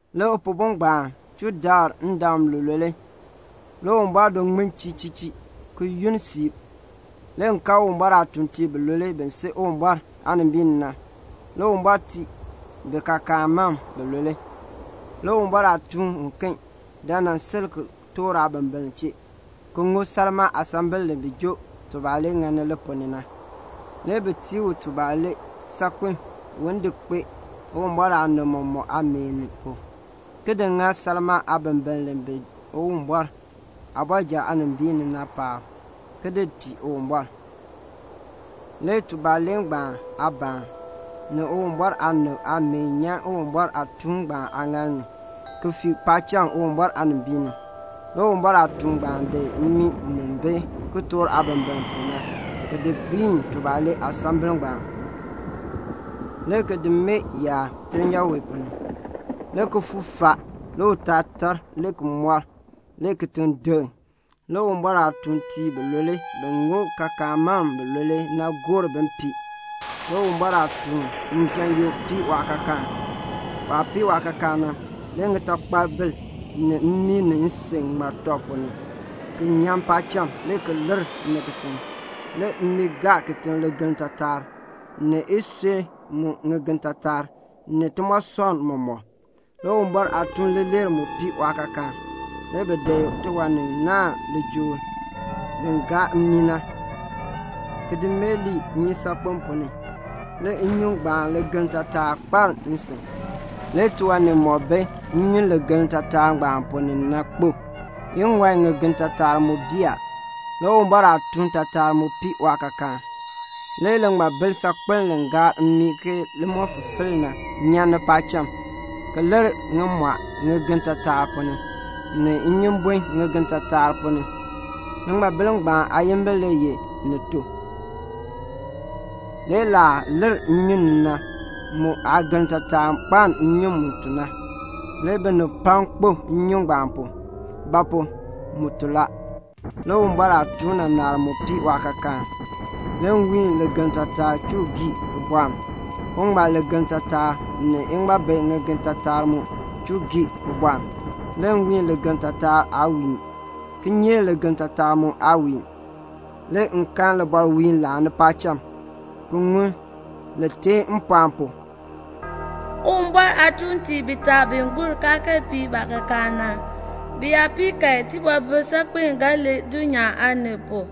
Le Upihbo ngbaan chuu dabr ndam lulule. Le Uwumbɔr do ŋmin chii chii le ni yunn siib. Le m kan Uwumbɔr aatuuntiib bilule bi si Uwumbɔr aanimbiin ni na. Le Uwumbɔr tii bi kaakaan mam bilule. Le Uwumbɔr aatuun uken dan nan sil kitork aabimbiln chee, ki ŋub salmaa aasambil li bi jɔ tubalee ŋani li ponn ni na. Le bi tii u tubalee saakpen un di kpee Uwumbɔr aanib mɔmɔk aameen pu, ki di ŋa salmaa aabimbiln li bi Uwumbɔr aabɔrjal aanimbiin ni na paab, ki di tii Uwumbɔr. Le tubalee ngbaan aabaan, ni Uwumbɔr aanib aameen nyan Uwumbɔr aatuun ngbaan aaŋaal ni, ki fii paacham Uwumbɔr aanimbiin ni. Le Uwumbɔr aatuun ngbaan di mmii mu bi kitork aabimbiln pu na ki di gbiin tubalee aasambil ngbaan, le ki di mee dulnyaa wee ponn ni. Le kifuuk faa, le utaal tar le ki moor, le kitiŋ deŋ. Le Uwumbɔr aatuuntiib bilule bi ŋub kaakaan mam bilule na gor bin pii. Le Uwumbɔr aatuun njan yoo pii waakaakaan. Waah pii waakaakaan na, le ŋitaatakpabil ni mmii ni nsin ŋmar tɔb ponn ni ki nyan paacham le ki lir ni kitiŋ. Le mmii gaa kitiŋ ligeln taatar, ni isui mu ŋigen taatar, ni timoosɔnn mɔmɔk. Le Uwumbɔr aatuun leeler mu pii waakaakaan. Le bi di tiwan ni naahn lijool li gaar mmii na, ki di mee nnyusaakpem ponn ni. Le nnyun ngbaan ligeln taatar kpaln nsin. Le tiwan nimɔk bi nnyun ligeln taatar ngbaan ponn ni na kpo. Iŋɔi ŋigen taatar mu bii a. Le Uwumbɔr aatuun taatar mu pii waakaakaan. Le liŋmabil saakpeln li gaar mmii ke limɔfifil na nyan paacham ki lir ŋimɔɔ ŋigen taatar ponn ni, ni inyumbun ŋigen taatar ponn ni. Liŋmabil ngbaan aayimbil le ye Ni To. Le laah lir nnyun ni na mu aageln taatar kpaln nnyun mu to na. Le binib pam kpo nnyun ngbaan pu; ba pu? mu to. Le Uwumbɔr aatuun naanar mu pii waakaakaan. Le nwiin ligeln taatar chuu gii bɔln. Uŋmal ligeln taatar, ni iŋmabi ŋigen taatar mu chuu gii bɔln. Le nwiin ligeln taatar aa wiin. Kinyeek ligeln taatar mu aa wiin. Le m kan libɔrwiin laani paacham, ki ŋun li teen mpɔɔn pu, "Uwumbɔr aatuuntiib bitaa bi gur kaa kee pii baakaakaan na, bi yaa pii kan, tibɔbil saakpeln ga lir dulnyaa aanib pu."